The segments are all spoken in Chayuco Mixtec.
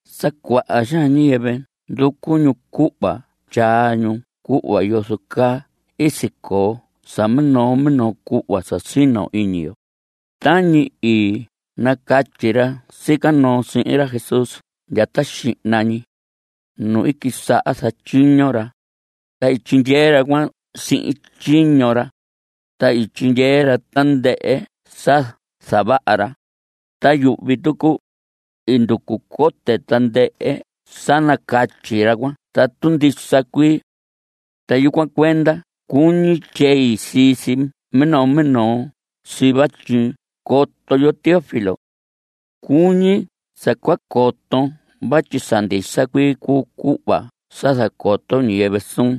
Sa cuaha xaan ñiyɨvɨ nducu ñu cuhva tyaa ñu cuhva yozo caa i sicoo sa minoo minoo cuhva sa sino iñi yo tañi i nacatyi ra sica noo sihin ra Jesús ndya ta xihna ñi, nu i quisaha zatyiño ra, ta i tyindyee ra cuan sihin tyiño ra. Ta i ndyehe ra tandɨhɨ sa zavaha ra. Ta yuhvi tucu, i nducu cote tandɨhɨ sa nacatyi ra cuan tatu ndisa cuii. Ta yucuan cuenda cuñi tyei sii si minoo minoo si vatyi coton, yoho Teófilo. Cuñi sa cua coton vatyi sa ndisa cuii cuu cuhva sa zacoto ñiyɨvɨ suun.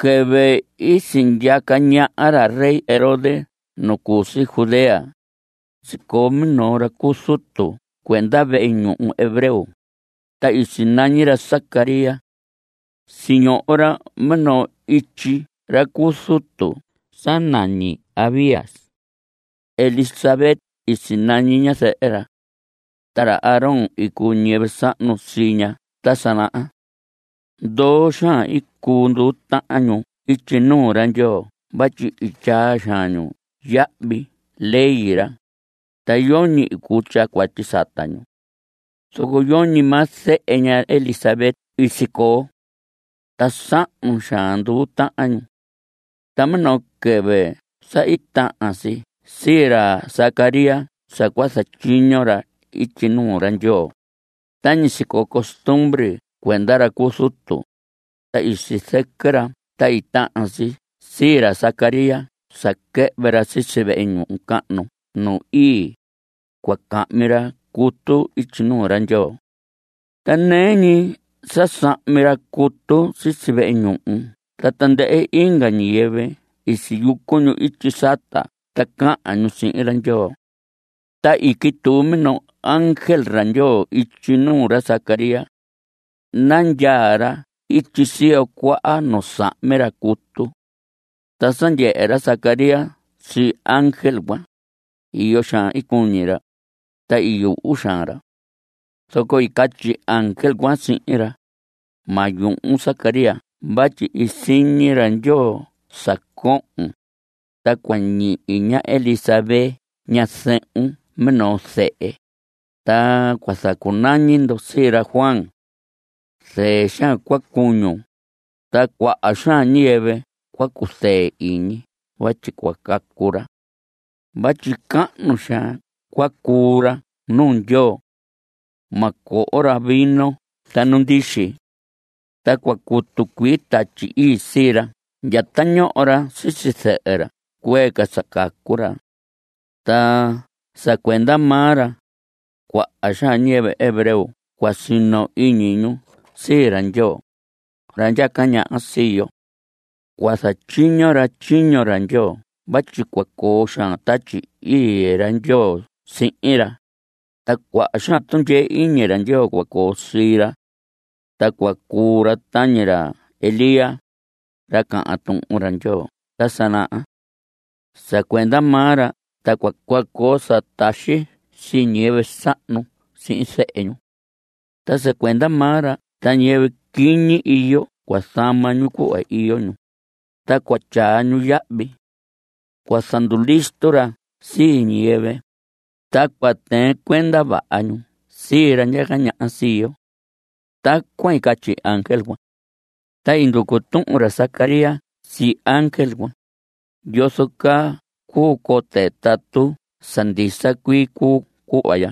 Quɨvɨ i sindyaca ñaha ra rey Herodes nu cu si Judea, sicoo minoo ra cu zutu cuenda vehe ñuhu hebreo, ta i sinañi ra Zacarías. Siñoho ra minoo ityi ra cu zutu sa nañi Abías. Elisabet i sinañi ñazɨhɨ ra. Ta ra Aarón i cuu ñiyɨvɨ sahnu sii ña ta sa naha. Ndoo xaan i cuu nduu tahan ñu ityi nuu ra Ndyoo vatyi i tyaa xaan ñu yahvi ley ra, ta yoñi i cuu tyaa cuatyi sata ñu. Zoco yoñi maa zehe ña Elisabet i sicoo. Ta sahnu xaan nduu tahan ñu. Ta minoo quɨvɨ sa i tahan si sii ra Zacarías sa cua zatyiño ra ityi nuu ra Ndyoo tañi sicoo costumbre cuenda ra cu zutu, ta i sizɨquɨ ra ta i tahan si sii ra Zacarías sa quɨhvɨ ra sisi vehe ñuhu cahnu nu ii, cua cahmi ra cutu ityi nuu ra Ndyoo. Ta nɨɨ ñi sa sahmi ra cutu sisi vehe ñuhu ta tandɨhɨ inga ñiyɨvɨ i siyucu ñu ityi sata ta cahan ñu sihin ra Ndyoo. Ta i quituu minoo ángel ra Ndyoo ityi nuu ra Zacarías. Nandyaa ra ityi siyo cuaha nu sahmi ra cutu. Ta sa ndyehe ra Zacarías sii ángel cuan, iyo xaan i cuñi ra, ta i yuhu xaan ra. Zoco i catyi ángel cuan sihin ra: Ma yuhun Zacarías vatyi i siñi ra Ndyoo sa cohon, ta cua ñihi ña Elisabet ñazɨhun minoo zehe, ta cua zacunañi ndo sii ra Juan. Zɨɨ xaan cua cuñun, ta cuaha xaan ñiyɨvɨ cua cuzɨɨ iñi vatyi cua cacu ra. Vatyi cahnu xaan cua cuu ra nuu Ndyoo. Ma coho ra vino ta nu ndixi. Ta cua cutu cuii Tatyi Ii sii ra ndya ta ñoho ra sisi zɨhɨ ra cuee ca sa cacu ra. Ta sa cuenda maa ra, cuaha xaan ñiyɨvɨ hebreo cua sino iñi ñu sii ra Ndyoo, ra ndyaca ñaha sii yo. Cua zatyiño ra tyiño ra Ndyoo vatyi cua coo xaan Tatyi Ii ra Ndyoo sihin ra, ta cuaha xaan tundyee iñi ra Ndyoo cua coo sii ra. Ta cua cuu ra tañi ra Elías, ra cahan Tuhun Ndyoo ta sa naha. Sa cuenda maa ra ta cua coo sa taxi sii ñiyɨvɨ sahnu sihin zehe ñu. Ta sa cuenda maa ra ta ñiyɨvɨ quiñi iyo cua zama ñu cuhva iyo ñu, ta cua tyaa ñu yahvi. Cua zandulisto ra sii ñiyɨvɨ, ta cua tɨɨn cuenda vaha ñu sii ra ndyaca ñaha sii yo. Tacuan i catyi ángel cuan. Ta i nducu tuhun ra Zacarías sii ángel cuan: ¿Yozo caa cuu cote tatu sa ndisa cuii cuu cuhva ya?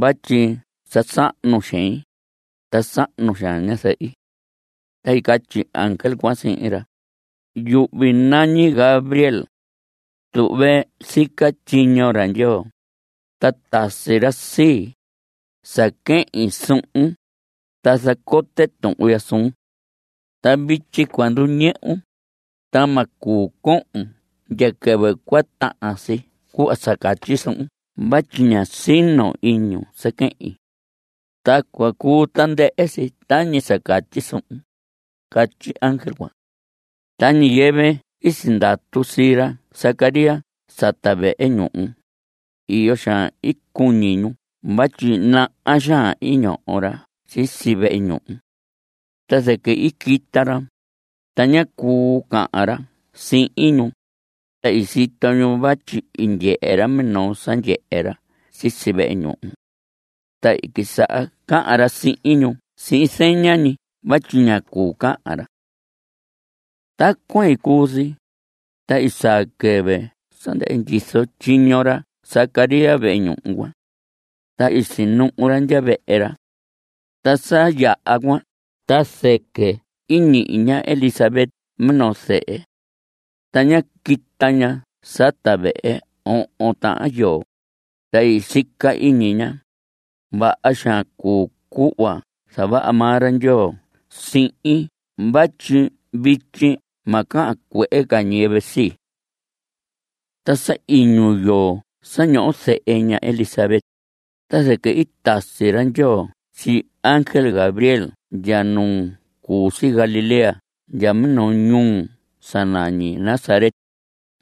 Vatyi sa sahnu xein, ta sahnu xaan ñazɨhi. Ta i catyi ángel cuan sihin ra: Yuhvi nañi Gabriel. Tuhve sica tyiño ra Ndyoo. Ta tasi ra sii, sa quehin suhun, ta zacote tuhun ya suun. Ta vityi cua nduñɨhun, ta ma cuu cohon ndya quɨvɨ cua tahan si cuhva sa catyi suhun vatyi ña sino iñun sa quehin. Ta cua cuu tandɨhɨ si tañi sa catyi suhun, catyi ángel cuan. Ta ñiyɨvɨ i sindatu sii ra Zacarías sata vehe ñuhu, iyo xaan i cuñi ñu vatyi naha xaan i ñoho ra sisi vehe ñuhu. Ta zɨquɨ i quita ra, ta ñá cuu cahan ra sihin ñu, ta i sito ñu vatyi i ndyehe ra minoo sa ndyehe ra sisi vehe ñuhu. Ta i quisaha cahan ra sihin ñu sihin zeña ñi vatyi ña cuu cahan ra. Tacuan i cuu si, ta i saa quɨvɨ sa ndɨhɨ ndyizo tyiño ra Zacarías vehe ñuhu cuan. Ta i sinuhu ra ndya vehe ra. Ta sa yaha cuan ta zɨquɨ i ñihi ña Elisabet minoo zehe. Ta ñá quita ña sata vehe ohon tahan yoo, ta i sica iñi ña: “Vaha xaan cuu cuhva zavaha maa ra Ndyoo sihin vatyi vityi ma cahan cuehe ca ñiyɨvɨ sii.” Ta sa iñu yoo sa ñoho zehe ña Elisabet, ta zɨquɨ i tasi ra Ndyoo sii ángel Gabriel ndya nu cu si Galilea ndya minoo ñuu sa nañi Nazaret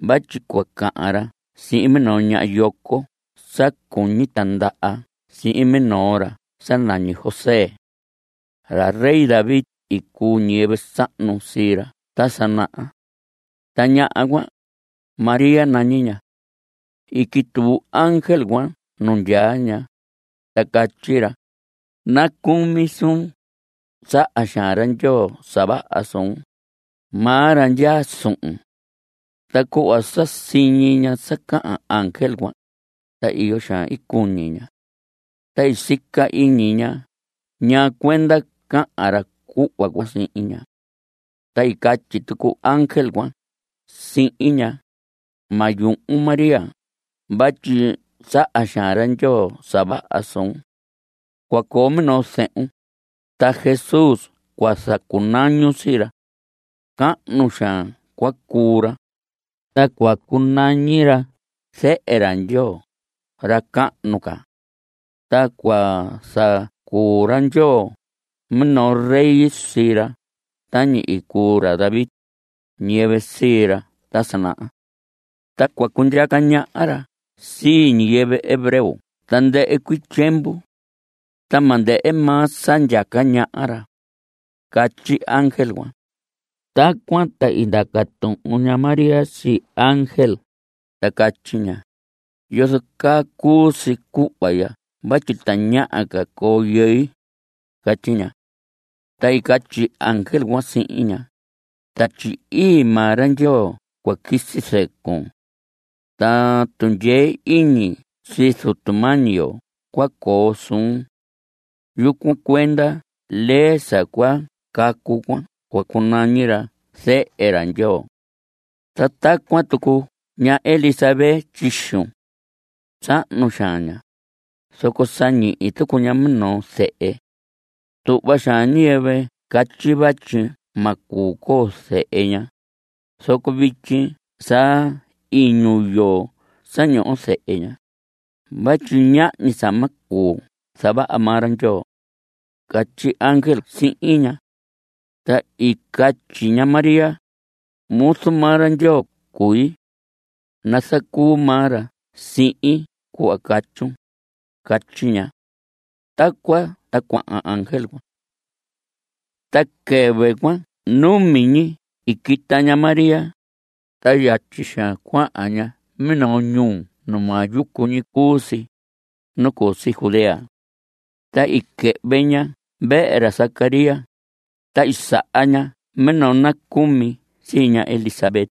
vatyi cua cahan ra sihin minoo ñaha yoco sa cuñi tindaha sihin minoo ra sa nañi José. Ra rey David i cuu ñiyɨvɨ sahnu sii ra ta sa naha. Ta ñaha cuan, María nañi ña. I quituu ángel cuan nu ndyaa ña, ta catyi ra: Nacumi suun. Saha xaan ra Ndyoo sa vaha suun. Maa ra ndyaa suhun. Ta cuhva sa siñi ña sa cahan ángel cuan, ta iyo xaan i cuñi ña. Ta i sica iñi ña ñaa cuenda cahan ra cuhva cuan sihin ña. Ta i catyi tucu ángel cuan sihin ña: Ma yuhun María vatyi saha xaan ra Ndyoo sa vaha suun. Cua coo minoo zehun. Ta Jesús cua zacunañun sii ra. Cahnu xaan cua cuu ra, ta cua cunañi ra Zehe ra Ndyoo ra cahnu ca. Ta cua zacuu ra Ndyoo minoo rey sii ra tañi i cuu ra David, ñiyɨvɨ sii ra ta sa naha. Ta cua cundyaca ñaha ra sii ñiyɨvɨ hebreo tandɨhɨ cuii tyiemvu. Ta ma ndɨhɨ maa sa ndyaca ñaha ra. Catyi ángel cuan. Tacuan ta i ndaca tuhun ña María sii ángel, ta catyi ña: ¿Yozo caa cuu si cuhva ya vatyi tañaha ca coo yɨi? Catyi ña. Ta i catyi ángel cuan sihin ña: Tatyi Ii maa ra Ndyoo cua quisi zɨcun. Ta tundyee iñi sii Zutu mañi yo cua coo suhun. Yucuan cuenda lee sa cua cacu cuan cua cunañi ra Zehe ra Ndyoo. Ta tacuan tucu ña Elisabet tyixun. Sahnu xaan ña, zoco sa ñihi tucu ña minoo zehe. Tuhva xaan ñiyɨvɨ catyi vatyi ma cuu coo zehe ña, zoco vityi sa iñu yoo sa ñoho zehe ña vatyi ñahñi sa ma cuu zavaha maa ra Ndyoo. Catyi ángel sihin ña. Ta i catyi ña María: Muzu maa ra Ndyoo cui. Nazacuu maa ra sihin cuhva catyun. Catyi ña. Tacuan ta cuahan ángel cuan. Ta quɨvɨ cuan numi ñi i quita ña María, ta yatyi xaan cuahan ña minoo ñuu nu maa yucu ñi cuu si, nu cu si Judea. Ta i quɨhvɨ ña vehe ra Zacarías, ta i saha ña minoo nacumi sii ña Elisabet.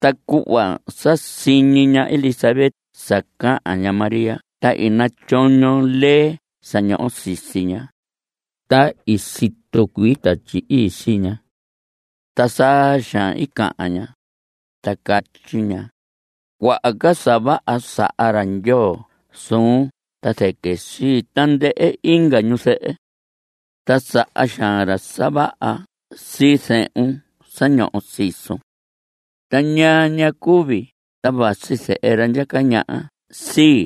Ta cuhva sa siñi ña Elisabet sa cahan ña María ta i natyoño lee sa ñoho sisi ña, ta i situ cuii Tatyi Ii sii ña. Ta saa xaan i cahan ña, ta catyi ña: Cuaha ca sa vaha saha ra Ndyoo suun ta zɨquɨ sii tandɨhɨ inga ñuzɨhɨ. Ta saha xaan ra sa vaha sii zehun sa ñoho sisun. ¿Ta ñaa ña cuu vii? ta vasi zɨhɨ ra ndyaca ñaha sii;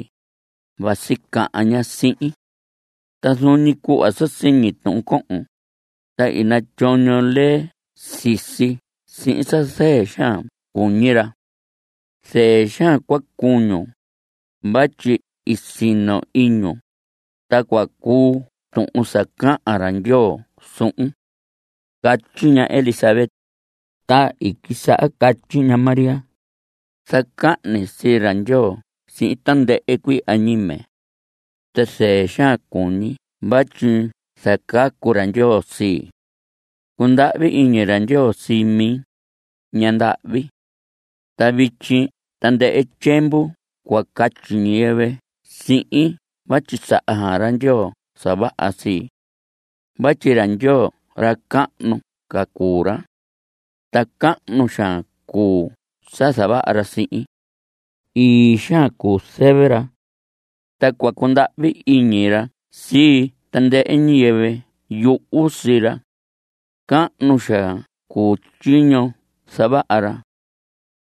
vasi cahan ña sihin. Ta zuun ñi cuhva sa siñi tuhun cohon, ta i natyoño lee sisi sihin sa zɨɨ xaan cuñi ra. Zɨɨ xaan cua cuñun, vatyi i sino iñun, ta cua cuu tuhun sa cahan ra Ndyoo suhun. Catyi ña Elisabet. Ta i quisaha catyi ña María: Zacahni sii ra Ndyoo sihin tandɨhɨ cuii añime. Ta zɨɨ xaan cuñi vatyi zacacu ra Ndyoo sii. Cundahvi iñi ra Ndyoo sii mi, ñaha ndahvi. Ta vityi tandɨhɨ tyiemvu cua catyi ñiyɨvɨ sihin vatyi saha xaan ra Ndyoo sa vaha sii. Vatyi ra Ndyoo ra cahnu ca cuu ra. Ta cahnu xaan cuu sa zavaha ra sihin. Ii xaan cuu zɨvɨ ra. Ta cua cundahvi iñi ra sii tandɨhɨ ñiyɨvɨ yuhu sii ra. Cahnu xaan cuu tyiño zavaha ra.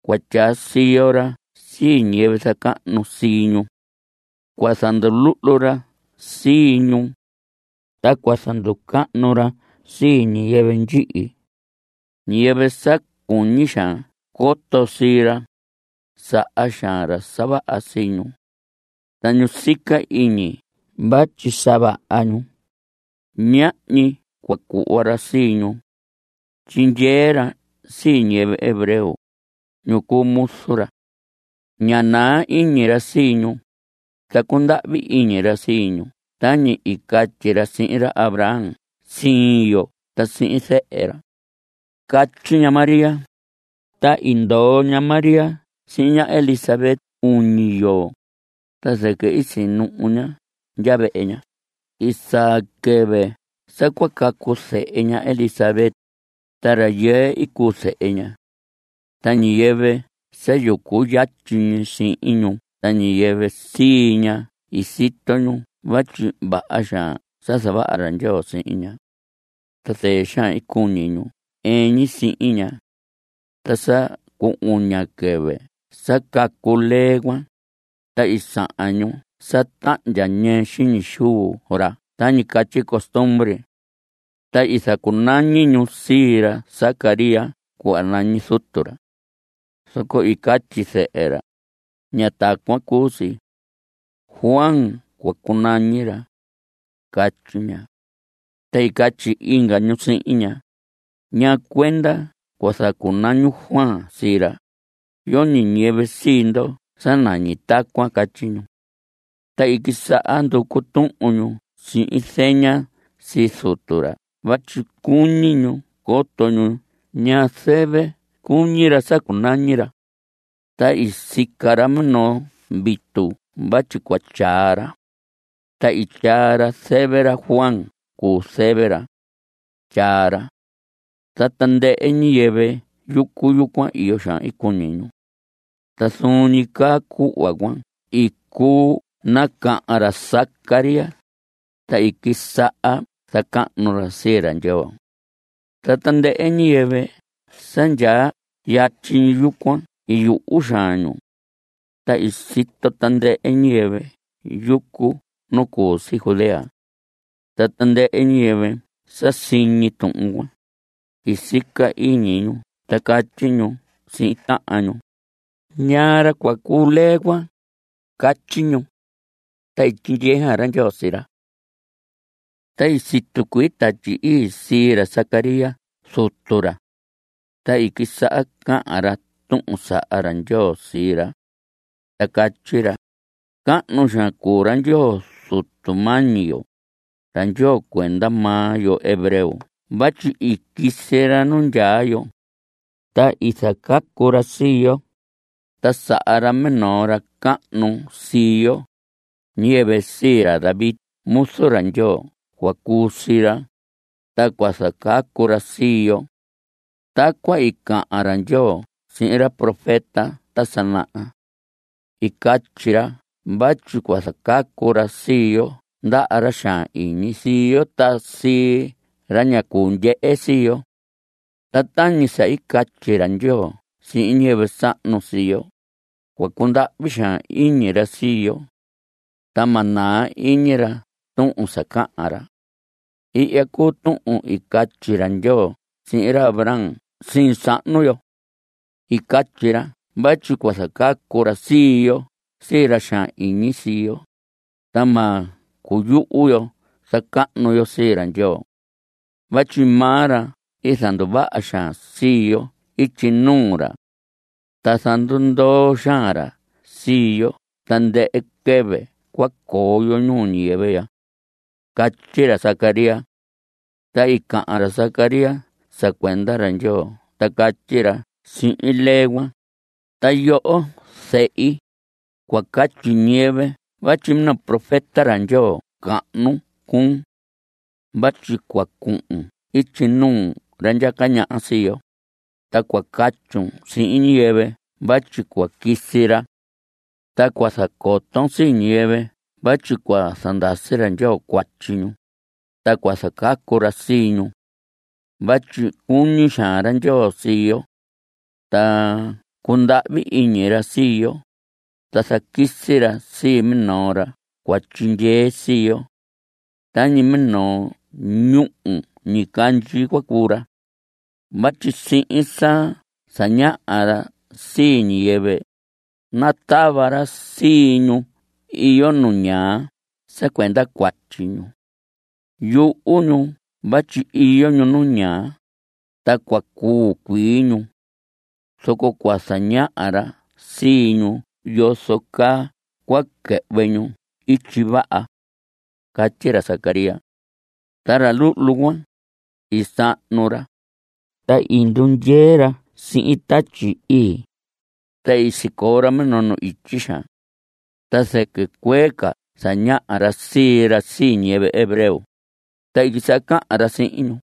Cua tyaa siyo ra sii ñiyɨvɨ zacahnu sii ñu. Cua zanduluhlu ra sii ñu. Ta cua zanducahnu ra sii ñiyɨvɨ ndyihi. Ñiyɨvɨ sa cuñi xaan coto sii ra, saha xaan ra sa vaha sii ñu. Ta ñu sica iñi vatyi sa vaha ñu, ñahñi cua cuhva ra sii ñu. Tyindyee ra sii ñiyɨvɨ hebreo, ñu cuu muzu ra. Ña naa iñi ra sii ñu, ta cundahvi iñi ra sii ñu tañi i catyi ra sihin ra Abraham siin yo ta sihin zehe ra. Catyi ña María. Ta i ndoo ña María sihin ña Elisabet uñi yoo, ta zɨquɨ i sinuhu ña ndya vehe ña. I saa quɨvɨ sa cua cacu zehe ña Elisabet, ta rayɨɨ i cuu zehe ña. Ta ñiyɨvɨ sa yucu yatyi sihin ñu ta ñiyɨvɨ sii ña i sito ñu vatyi vaha xaan sa zavaha ra Ndyoo sihin ña. Ta zɨɨ xaan i cuñi ñu ɨɨn ñi sihin ña. Ta sa cu uña quɨvɨ sa cacu lee cuan, ta i sahan ñu sa tahndya ñɨɨ xiñi xuu ra tañi catyi costumbre. Ta i zacunañi ñu sii ra Zacarías cuhva nañi zutu ra. Zoco i catyi zɨhɨ ra: Ña tacuan cuu si. Juan cua cunañi ra. Catyi ña. Ta i catyi inga ñu sihin ña: ¿Ñaa cuenda cua zacunañun Juan sii ra? Yoñi ñiyɨvɨ sii ndo sa nañi tacuan. Catyi ñu. Ta i quisaha nducu tuhun ñu sihin zeña sii zutu ra vatyi cuñi ñu coto ñu ñaa zɨvɨ cuñi ra sa cunañi ra. Ta i sica ra minoo vitu vatyi cua tyaa ra. Ta i tyaa ra zɨvɨ ra: Juan cuu zɨvɨ ra. Tyaa ra. Ta tandɨhɨ ñiyɨvɨ yucu yucuan, iyo xaan i cuñi ñu. Ta zuun ñi caa cuhva cuan i cuu nacahan ra Zacarías, ta i quisaha zacahnu ra sii ra Ndyoo. Ta tandɨhɨ ñiyɨvɨ sa ndyaa yatyi yucuan i yuhu xaan ñu. Ta i sito tandɨhɨ ñiyɨvɨ yucu nu cu si Judea. Ta tandɨhɨ ñiyɨvɨ sa siñi tuhun cuan, i sica iñi ñu ta catyi ñu sihin tahan ñu: ¿Ñaa ra cua cuu lee cuan? Catyi ñu. Ta i tyindyee xaan ra Ndyoo sii ra. Ta i situ cuii Tatyi Ii sii ra Zacarías zutu ra. Ta i quisaha cahan ra tuhun sa saha ra Ndyoo sii ra. Ta catyi ra: Cahnu xaan cuu ra Ndyoo Zutu mañi yo, ra Ndyoo cuenda maa yo hebreo vatyi i quisi ra nu ndyaa yo, ta i zacacu ra sii yo. Ta saha ra minoo ra cahnu sii yo; ñiyɨvɨ sii ra David muzu ra Ndyoo cua cuu sii ra, ta cua zacacu ra sii yo. Tacuan i cahan ra Ndyoo sihin ra profeta ta sa naha. I catyi ra vatyi cua zacacu ra sii yo ndaha ra xaan iñi sii yo ta sii ra ña cuu ndyehe sii yo. Ta tañi sa catyi ra Ndyoo sihin ñiyɨvɨ sahnu sii yo, cua cundahvi xaan iñi ra sii yo. Ta ma naa iñi ra tuhun sa cahan ra. Ihya cuu tuhun i catyi ra Ndyoo sihin ra Abraham siin sahnu yo. I catyi ra vatyi cua zacacu ra sii yo sii ra xaan iñi sii yo, ta ma cuyuhu yo zacahnu yo sii ra Ndyoo. Vatyi maa ra zanduvaha xaan sii yo ityi nuu ra. Ta zandundoo xaan ra sii yo tandɨhɨ quɨvɨ cua coo yo ñuu ñiyɨvɨ ya. Catyi ra Zacarías. Ta i cahan ra Zacarías sa cuenda ra Ndyoo ta catyi ra sihin lee cuan: Ta yoho zehi, cua catyi ñiyɨvɨ vatyi minoo profeta ra Ndyoo cahnu cuun. Vatyi cua cuhun ityi nuu ra ndyaca ñaha sii yo, ta cua catyun sihin ñiyɨvɨ vatyi cua quisi ra. Ta cua zacoton sii ñiyɨvɨ vatyi cua zandasi ra Ndyoo cuatyi ñu, ta cua zacacu ra sii ñu. Vatyi cuñi xaan ra Ndyoo sii yo. Ta cundahvi iñi ra sii yo, ta zaquisi ra sii minoo ra cua tyindyee sii yo. Tañi minoo ñúhu ñicandyi cua cuu ra. Vatyi sihin sa zañaha ra sii ñiyɨvɨ, natava ra sii ñu iyo nu ñaa sa cuenda cuatyi ñu. Yuhu ñu vatyi iyo ñu nu ñaa, ta cua cuu cuii ñu. Zoco cua zañaha ra sii ñu yozo caa cua quɨhvɨ ñu ityi vaha. Catyi ra Zacarías. Ta ra luhlu cuan, i sahnu ra, ta i ndundyee ra sihin Tatyi Ii. Ta i sicoo ra minoo nu ityi xaan. Ta zɨquɨ cuee ca zañaha ra sii ra sii ñiyɨvɨ hebreo, ta i quisaha cahan ra sihin ñu.